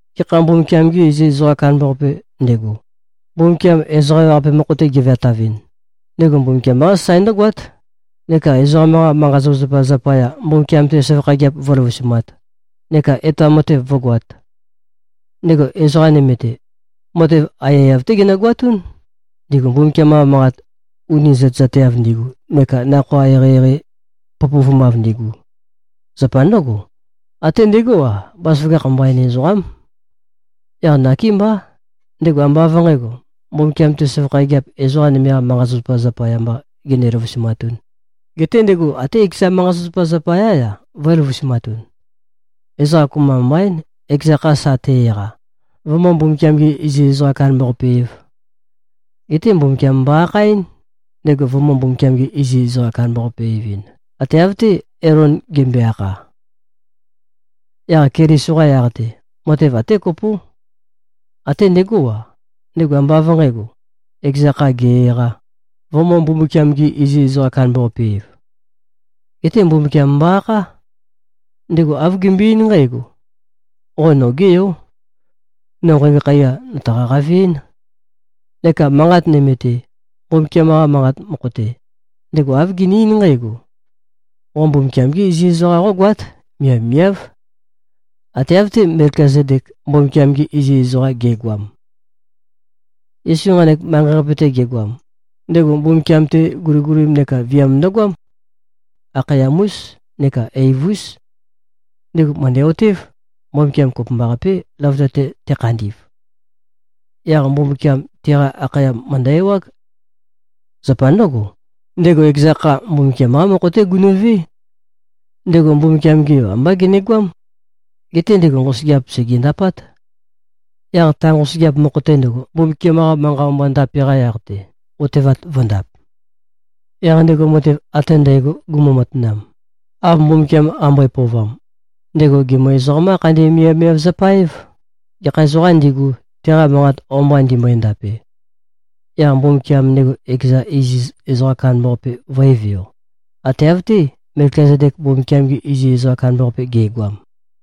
Gekha Mbumbukiam-ge iziz ezoqam kandambaqapē ndego, Mbumbukiam ezoqa ewaqape mokho-te geveatavɨn, ndego Mbumbukiam-qá sasae ndǿgoát, neka ezoqam-qa manqa-zapazapa zapaya, Mbumbukiam-te søvakha gigiap vǿløvusumāt neka etoam matev vǿgoāt. Ndego ezoqa nøme-te, matev aiyaiyav-té genøgoatún, ndigu Mbumbukiam-qa manqat uni zøtezateav ndigu neka nakhoa eqeieqei pøpøvumav ndigu. Zapa ndǿgo, até ndegó-a, bazaføgakh mbain ezoqám. Yaq nakémbá, ndego ambá av nqǣgo, Mbumbukiam-te søvakha gigiap ezoqa nøme-qa manqa-zapazapa zapaya mbā gene-løvusumatūn, geté ndego até ekeza manqa-zapazapa zapayā-ya, vø̄e-løvusumatun. Ezoqa kopømba mbaín, ekeza kha sa te-eqa, vømǿ-Mbumbukiam-ge-iziz-ezoqa-kandambaqape-ēv. Geté Mbumbukiam mbo-akhaɨ́n, ndego vømø̄-Mbumbukiam-ge-iziz-ezoqa-kandambaqape-evɨn, ate av-té, Elon gembøe-akha. Yaq Keliso-qa yaq-te, matev até kopó. Até ndegó-a, ndego ambá av nqǣgo, ekeza kha ge-eqā, vømø̄-Mbumbukiam-ge-iziz-ezoqa-kandambaqape-ev. Geté Mbumbukiam mbo-akhá. Ndego āv gembøe-eín nqǽgo, “Qo nogé yó. No nqægo khaiya, nø̀taqa-qave-én.” Neka manqat nøme-te, Mbumbukiam-qa Manqat mokho-te, ndego āv gene-eín nqǽgo, “Qo Mbumbukiam-gé iziz ezoqam qógoát. Miavmiáv, Ate av-té, Melkizedek Mbumbukiam-ge iziz ezoqam ge꞉goam.” Yesu nqanek manqei-qape-te gegoam, ndego Mbumbukiam-te guligulim neka viam ndøgoám. Akhayam-ús neka eiv-ús. Ndego mø̀ndæ-otév, Mbumbukiam kopømbaqapé, løvøte-te tekhandi꞉v. Yaq Mbumbukiam, teqa akhayam mø̀ndø-ewág. Zapa ndǿgo, ndego ekeza kha, Mbumbukiam-qá mokho-té gunu꞉vé. Ndego Mbumbukiam-ge Yo ambá genegoám. Geté ndego nqosøgeap sègendapát. Yaq ta nqosøgeap mokho-te ndøgo, Mbumbukiam-qa manqa o-mba ndape-qa yaq-te, otevat vø̄ndap. Yaq ndego matev ate ndægo gumu-matanam, av Mbumbukiam qambøe-pøovam, ndego gèmø-ezoqam-qá-khandi-miavmiav-zapa-év, gekha ezoqām ndigu, teqa manqa o-mba ndimbøe-ndape. Yaq Mbumbukiam ndego ekeza iziz ezoqa kandambaqape vø̄e-veo, ate av-té, Melkizedek Mbumbukiam-ge iziz ezoqa kandambaqape ge꞉goam.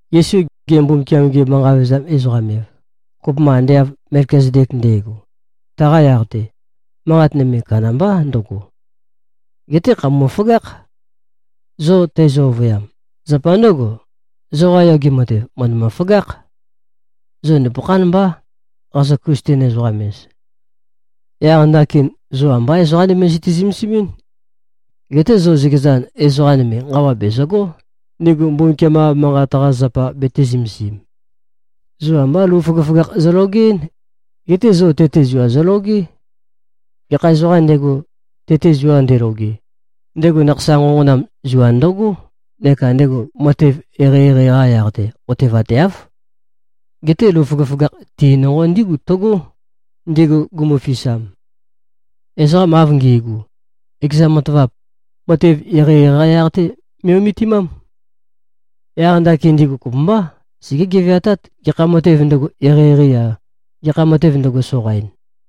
Yesu gemø-Mbumbukiam-ge-manqa-vevezam-ezoqam-ev, kopømba ande av Melkizedek nde꞉go, taqa yaq-te, manqat nøme kandambá ndøgo. Geté, khàpeme꞉-føgákh, zo teizø-ovøyam. Zapa ndǿgo, zoqa yoge matev mø̀ndømø-føgákh. Zo nupøkhán mbá, qazo-Klisten-ezoqam-ez. Yaq ndakin, zo ambá ezoqa nøme zøte-zømesimín. Geté zo zøkezan, ezoqa nøme nqawa bèzøgó, ndigu Mbumbukiam-qa Manqat-qa zapa betē-zømesim. Zo ambá lou føgøføgakh zologeɨ́n. Geté zo tete zua zologé. Gekha ezoqām ndego, tete zua ndeloge, ndego nakhasa nqonqonam zua ndøgó neka ndego matev eqeieqei-qa yaq-te otevateáv. Geté lou føgøføgakh ti nonqo ndígu tøgó, ndigu gumufisam. Ezoqam av ngi꞉gu, ekeza matavap, matev eqeieqei-qa yaq-te me꞉-ometimám. Yaq ndakin ndigu kopømbá, segé-geveatát, gekha matev ndøgo, eqeieqeī-a, gekha matev ndøgo, soqain.